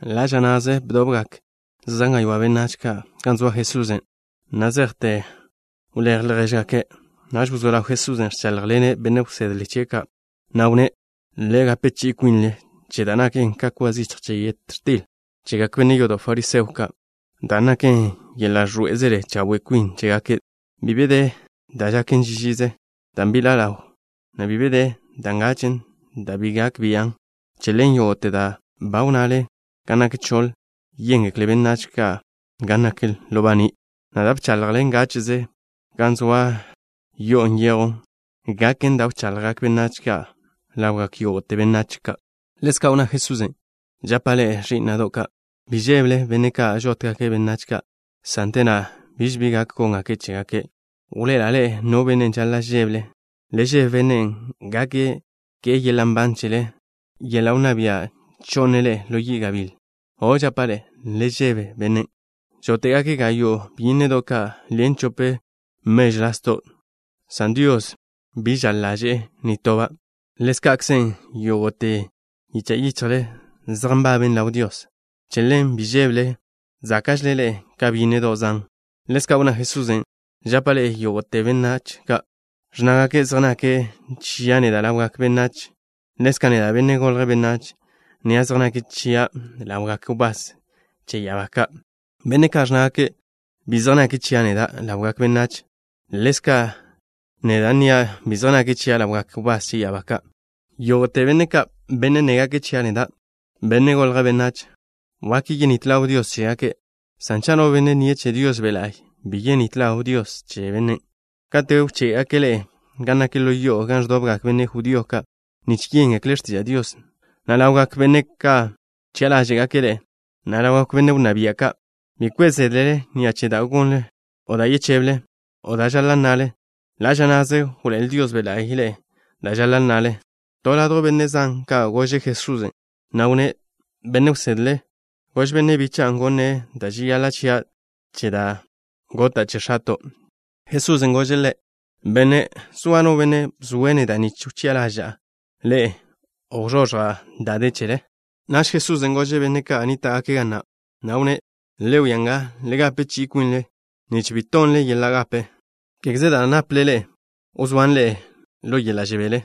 Ḻa' ža na'ze bdobgak zan gaywá' benách gan zoa Jesusen', na' zejte wléj ljéžgake'. Naž wzó ḻaw Jesusen' ẕcháḻjḻene' benne' wsedle chie' ka', na' wnné': —Le gape chi'i kwinle che da' naken ka kwa zichj che yet x̱til chegak benne' yodo' fariseo ka', dan' naken yeḻa' ẕḻoé'ezele chawe' kwin chégake'. Bi be de da' žaken ži žize dan' bi ḻa' ḻawlen, na' bi be de da' ngachen' dan' bi gak bian'. Che ḻen, yógo'te da' ba wnnale gan nak choḻ, yéngekle benách ka' gan nak ḻo baní', na' da' bchaḻjle ngáche'ze gan wzóa ḻo yo'o nyejwn, gaken da' wchaḻjgak benách ka' ḻawgak yógo'te benách. Ḻezka' wnná Jesusen': —Žapa' ḻe'e, ẕí'na'do' ka': bi žébele benne' ka' žótgake' benách ka', san te na' biž bi gak góngake' chégake'. Wḻoe'ela' ḻe'e no benne' žaḻa' žébele. Le žebe Bennen' gak ke'e yeḻa' nban chele, na' te na' nape' yeḻa' wnná bia' cho'ne' ḻe'e ḻo yi' gabíl. O', žapa' ḻe'e, le žebe Bennen'. ’Žóte'gake' gayo' byínnedo' ka' ḻen chope mežw lasdo', san Dios bi žaḻ ḻaže'e nitoba'. Ḻézka'kzen, yógo'te yicha' yichjle zej nbaben ḻaw Dios. Che ḻen, bi žébele. Záka'žele ḻe'e ka byínnedo' zan. Ḻezka' wnná Jesusen': —Žapa' ḻe'e: yógo'te benne' ka' ẕnnágake' zej nake' chia' neda' ḻawgak benách, ḻezka' neda', Benne' Golje' Benách, nnia' zej nake' chia' ḻawgak wbás che ya'abá ka'. Benne' ka' ẕnnágake' bi zej nake' chia' neda' ḻawgak benách, ḻezka' neda' nnia' bi zej nake' chia' ḻawgak wbás che ya'abá ka'. ’Yógo'te benne' ka', benne' nnégake' chia' neda', Benne' Golje' Benách, wak yenít ḻaw Dios chégake', san cha' no benne' nnie' che Dios Be' La'y, bi yenít ḻaw Dios che bennen'. ’Kate' wché'gake' ḻe'e gan nak ḻo yo'o gan ẕdobgak benne' judío ka' nich yéngekle' x̱tiža' Dios, na' ḻawgak benne' ka' wchi'a ḻáže'gake' ḻe'e, na' ḻawgak benne' wnná bia' ka', bi kwe' zédlele ni'a che da' gonle, o da' yecheble, o da' žaḻa' nnale. Ḻa' ža na'ze wḻoé'el Dios Be' La'y ḻe'e da' žaḻa' nnale. To benne' ladjw benne' zan ka' gože' Jesusen', na' wnné': —Benne' wsedle, gož benne' bicha'a gonne' da' žeyaḻa' chia' che da' gota' che x̱ato'. Jesusen' gože' ḻe': —Benne'. ¿Zoa no benne' bzoe' neda' nich wchi'a ḻaža'a ḻe'e, o wzoẕja' da' de chele? Naž Jesusen' gože' benne' ka' nníta'gake' ga na', na' wnné': —Le wia nga. Le gape chi'i kwinle nich bi tonle yeḻa' gape. Kégeze da' nápḻe'ele wzóan ḻe'e ḻo yeḻa' žebele.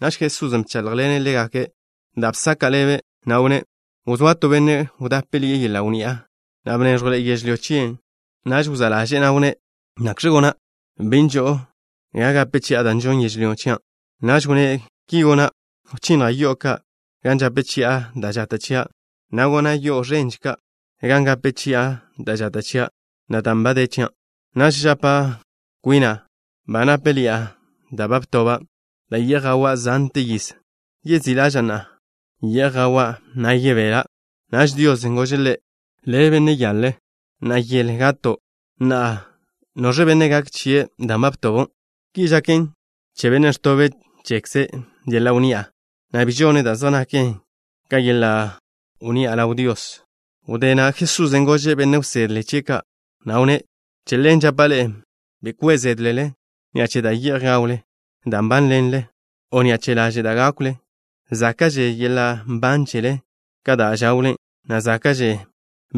Naž Jesusen' bcháḻjḻene' ḻégake' da' bsaka' ḻebe', na' wnné': —Wzóa to benne' wdápeḻi'e yeḻa' wnni'a, na' bnéẕjwḻe'e yežlyó chie'. Naž wzá' ḻaže'e, na' wnné': “¿Nakx̱kze gona'? Bi nžo'o ga gape chi'a da' žonn yežlyó chia'.” Naž wnné': “Ki gona'. Wchinnja' yo'o ka' gan žape chi'a da' žata' chia', na' gona' yo'o ẕenže ka', gan gape chi'a da' žata' chia', na' dan' ba de chia'. Naž yapa' kwina': ba nápeḻi'a da' ba btoba', da' ye'j gawa' zante yiz. Yezí' ḻaža'a. Ye'j gawa', na' yebela'.” Naž Dios gože' ḻe': “Le' bi be nnezlo'. Na'a yele gato'. Na'a, ¿noẕe benne' gak chie' dan' ba btobon'?” Ki žaken che bennen' ẕtobe' chekze' yeḻa' wnni'a, na' bi žone' da' zej naken ka yeḻa' wnni'a ḻaw Dios. Wdé na' Jesusen' gože' benne' wsedle chie' ka', na' wnné': —Che ḻen žapa' ḻe'e: bi kwe' zédlele ni'a che da' ye'j gawle, dan' nbánḻenle, o ni'a che laže' da' gákwle. Záka'že yeḻa' nban chele ka da' žawlen, na' záka'že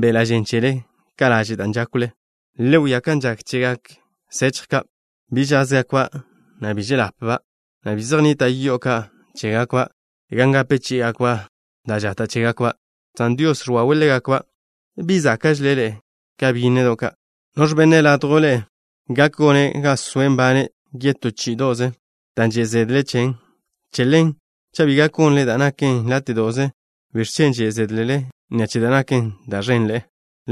beḻa' žen chele ka laže' da' žákwlen. Le wia kan žak chegak sechj ka'. Bi žázgakba', na' bi žel-ḻapba', na' bi zej nnita' yo'o ka' chégakba' gan gape chí'igakba' da' žata' chégakba', san Dios ẕwawe' ḻégakba'. ¿Bi záka'žele ḻe'e ka byínnedo' ka'? ¿Noẕ benne' ládjwle ḻe'e gak gone' ga soe' nbane' yetó chí'ido'ze dan' že' zedle' chen? Che ḻen, cha' bi gak gonle da' naken láte'do'ze, ¿biẕ chen' že' zédlele ni'a che da' naken da' ẕenḻe'e?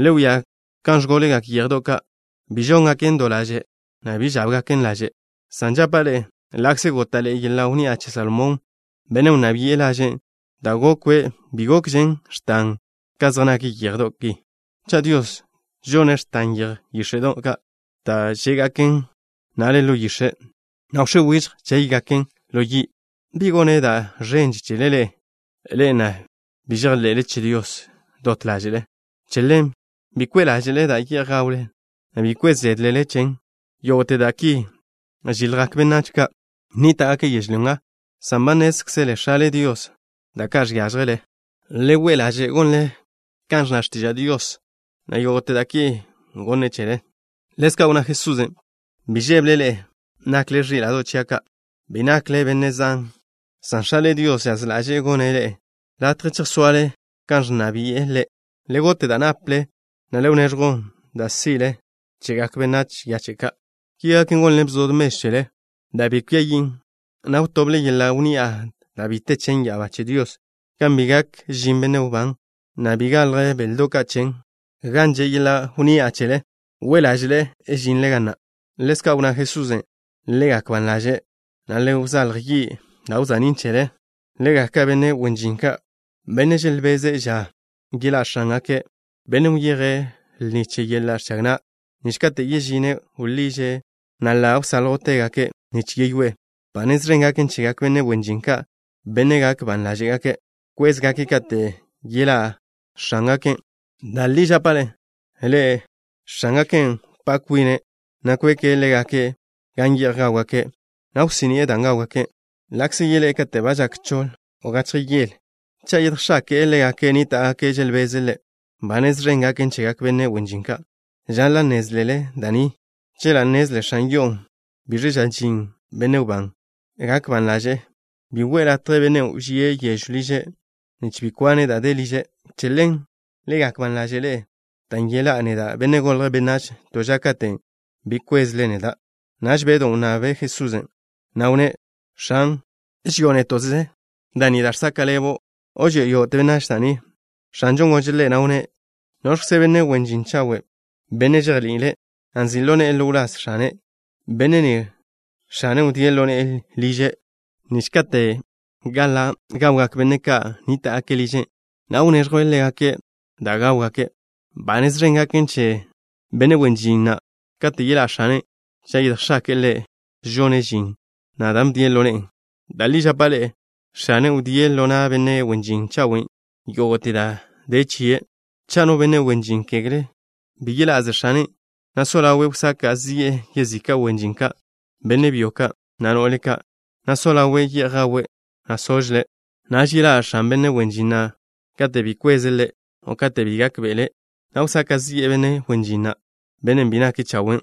’Le wia kan ẕgólegak yéjedo' ka'. Bi žóngaken do laže', na' bi žábgaken laže', san žapa' ḻe'e, ḻa'kze góta'ḻe'e yeḻa' wnni'a che Salomón, bennen' wnná bi'e, lažen' da' gokwe' bi gokžen x̱tan ka zej nak yéjedo' ki. Cha' Dios žone' x̱tan yeje yíx̱e'do' ka' da' žé'gaken na'a ḻe'e yix̱e', na' wx̱é wižj chéygaken ḻo yi', ¿bi gone' da' ẕenže chele ḻe'e, ḻe'e na' bi žejḻe'le che Dios dot ḻáže'le? Che ḻen, bi we' ḻáže'le da' ye'j gawle, na' bi kwe' zédlele chen. Yógo'te da' ki žiljgak benách ka' nníta'gake' yežlyó nga, san ba nnézkzele X̱ale Dios da' ka' žiážjele. Le we' ḻaže' gonle kan ẕnna x̱tiža' Dios, na' yógo'te da' ki gonne' chele. Ḻezka' wnná Jesusen': —Bi žébele ḻe'e, nakle ẕíla'do' chia' ka'. Bi nakle benne' zan, san X̱ale Dios žaz ḻaže'e gonne' ḻe'e latje chejsoale gan ẕnna bi'e Ḻe'. Le gote' da' naple, na' le wneẕjw da' si'le chegak benách yache' ka'. Ki gaken, gonle bzod mežw chele da' bi kwia yin', na' wtoble yeḻa' wnni'a da' bi te chen ya'abá che Dios, gan bi gak žin benne' wbán, na' bi galj béledo' chen. Gan že' yeḻa' wnni'a chele, we' ḻáže'le žinle ga na'. Ḻezka' wnná Jesusen': —Le gak ban ḻaže', na' le wzálj yi' da' wza'nín' chele. Le gak ka benne' wen žin ka', benne' želbeze' ža yeḻá' x̱ángake', bennen' wyeje' lni che yeḻa' ẕchag na', nich kate' yežine', wḻiže', na' ḻa' wsáljwtegake' nich yeyoé'e. Ba nez ẕen gaken chegak benne' wen žin ka', benne' gak ban ḻáže'gake' kwézgake' kate' yeḻa'že x̱ángake'. Da' li žapa' ḻe'e, x̱ángaken' wpá' kwine', na' kweke' ḻégake' gan ye'j gáwgake', na' wsí'ni'e dan' gáwgake'. Ḻa'kze yeḻé'e kate' ba žak choḻ o gachje yele, cha' yedjx̱ake'e ḻégake' nníta'gake' želbeze' ḻe', ba nez ẕen gaken chegak benne' wen žin ka'. Žaḻa' nnézlele da' ni. Chela' nnezle x̱an yo'o biẕ ža žin benne' wbán, gak ban ḻaže'e, na' bi we'e latje bennen' wžíe' yežw liže', nich bi kwane' da' de liže'. Che ḻen, le gak ban ḻaže' ḻe'e, dan' yeḻá'a neda', Benne' Golje' Benách, to ža katen' bi kwezle neda'. Naž Bedw wnnable' Jesusen', na' wnné': —X̱an, ¿ži'o néto'ze da' ni da' žsaka' ḻebo', o ži'o yógo'te benách da' ni? X̱anžon' gože' ḻe', na' wnné': —¿Noẕkzen' benne' wen žin chawe', benne' žejni'ile', na' nzi' ḻo ne'e ḻo wláz x̱ane'? Benne' ni, x̱ane' wdíe' ḻo ne'e liže', nich kate' gaḻa' gawgak benne' ka' nníta'gake' liže', na' wneẕjwe' ḻégake' da' gáwgake'. Ba nez ẕen gaken che benne' wen žin na' kate' yeḻá' x̱ane', cha' yedjx̱ake'e ḻe' žone' žin na' da' bdien' ḻo ne'e. Da' li žapa' ḻe'e, x̱ane' wdíe' ḻo na' benne' wen žin chawen' yógo'te da' de chie'. Cha' no benne' wen žin gekle' bi yeḻá' ze x̱ane', na' so ḻawe' wsaka' zi'e yezika' wen žin ka', benne' byo ka', na' no'le ka', na' so ḻawe' ye'j gawe', na' sožle', naž yeḻá' x̱an benne' wen žin na' kate' bi kweze' ḻe', o kate' bi gákbe'ele', na' wsaka' zi'e benne' wen žin na', benne' bi nake' chawe',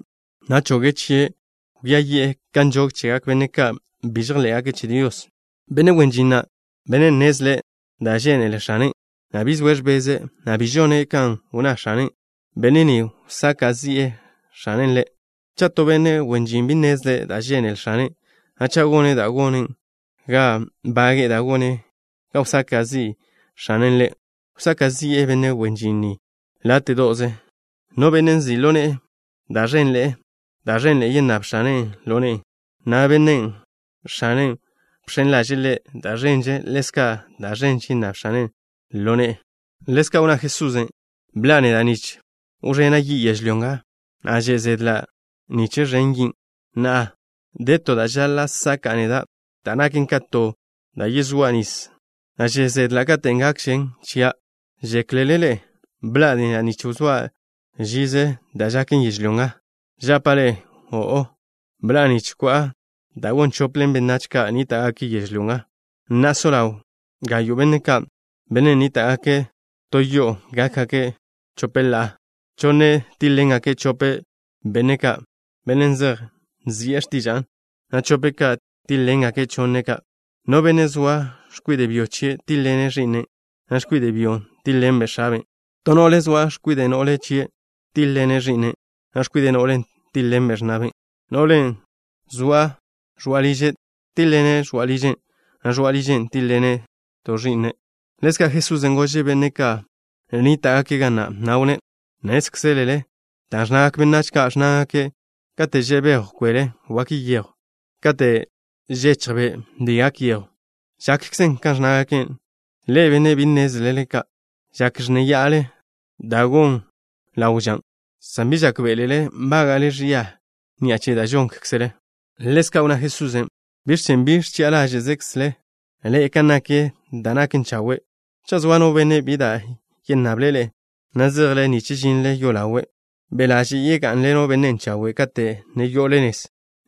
na' choge' chie' kwia yi'e kan nžog chegak benne' ka' bi žejḻé'gake' che Dios. ’Benne' wen žin na', benne' nnezle' da' žénele x̱ane', na' bi zoe' ẕbeze', na' bi žone' kan wnná x̱ane', benne' ni, wsaka' zi'ḻe'e x̱ane' ḻe'. Cha' to benne' wen žin bi nnezle' da' žénele x̱ane', na' cha' gone' da' gonen ga bage'e da' gonen ga wsaka' zi' x̱ane' ḻe', wsaka' zi'e benne' wen žin ni láte'do'ze. No benne' nzi' ḻo ne'e da' ẕenḻe'e, da' ẕenḻe'e yennáb x̱ane' ḻo ne'e, na' bennen' x̱ane' bx̱en ḻaže'e ḻe' da' ẕenže, ḻezka' da' ẕenže yennáb x̱anen' ḻo ne'e. Ḻezka' wnná Jesusen': —Bḻa'a neda' nich wẕena' yi' yežlyó nga, na' že' zedla' nich ẕen yin'. Na'a, de to da' žaḻa' saka'a neda' da' naken ka to da' yezóa' nis, na' že' zedla' kate' gakžen chia'. ¿Žéklele ḻe'e bḻa'a neda' nich wzóa' žize da' žaken yežlyó nga? Žapa' ḻe'e: O'o. Bḻa'a nich ko'a da' gon chople benách ka' nníta'gake' yežlyó nga. Na'a so ḻaw gayo' benne' ka', benne' nníta'gake' to yo'o gákgake' chope ḻa'a. Chonne' tíḻ-ḻengake' chope benne' ka', benne' zej nzi'e x̱tiža'a, na' chope' ka' tíḻ-ḻengake' chonne' ka'. No benne' zoa x̱kwide' byo chie' tíḻ-ḻene' ẕi'nen', na' x̱kwide' byon' tíḻ-ḻenbe' x̱aben'. To no'le zoa x̱kwide' no'le chie' tíḻ-ḻene' ẕi'nen', na' x̱kwide' no'len' tíḻ-ḻenbe' x̱na'ben'. No'len' zoa ẕoa' liže' tíḻ-ḻene' ẕoa' ližen', na' ẕoa' ližen' tíḻ-ḻene' to' ẕi'nen'. Ḻezka' Jesusen' gože' benne' zan ka' nníta'gake' ga na', na' wnné': —Nnézkzele dan' ẕnnagak benách ka', ẕnnágake': “Kate' že' bejw kwele wak yejw. Kate' žechj be' bi gak yejw.” Žakkzen kan ẕnnágake'. Ḻe'e, benne' bi nnezle ka'. Žak ẕnnéya'ale da' gon ḻawe' ža, san bi žákbe'elele nbága'le ẕia ni'a che da' žónkzele. Ḻezka' wnná Jesusen': —¿Biẕ chen' bi ẕchi'a ḻáže'kzle ḻe'e kan nak da' naken chawe'? Cha' zoa no benne' bi da' yennable' le', na' zejle nich žinle yolawe', be' ḻaže' yegá'nḻeno' bennen' chawe' kate' ne yo'ole nez,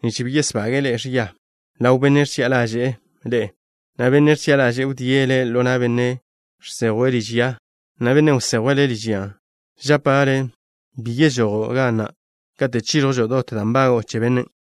nich bi yesbage'e le' ẕia ḻaw benne' ẕchi'a ḻaže'e ḻe'e, na' bennen' ẕchi'a ḻaže'e wdíe' le' ḻo na' benne' žsejwe' liž ya, na' bennen' wsejwe' le' liž yan'. Žapa' le', bi yežojo' ga na' kate' chíẕjwžo' dot da' nbago'o che bennen'.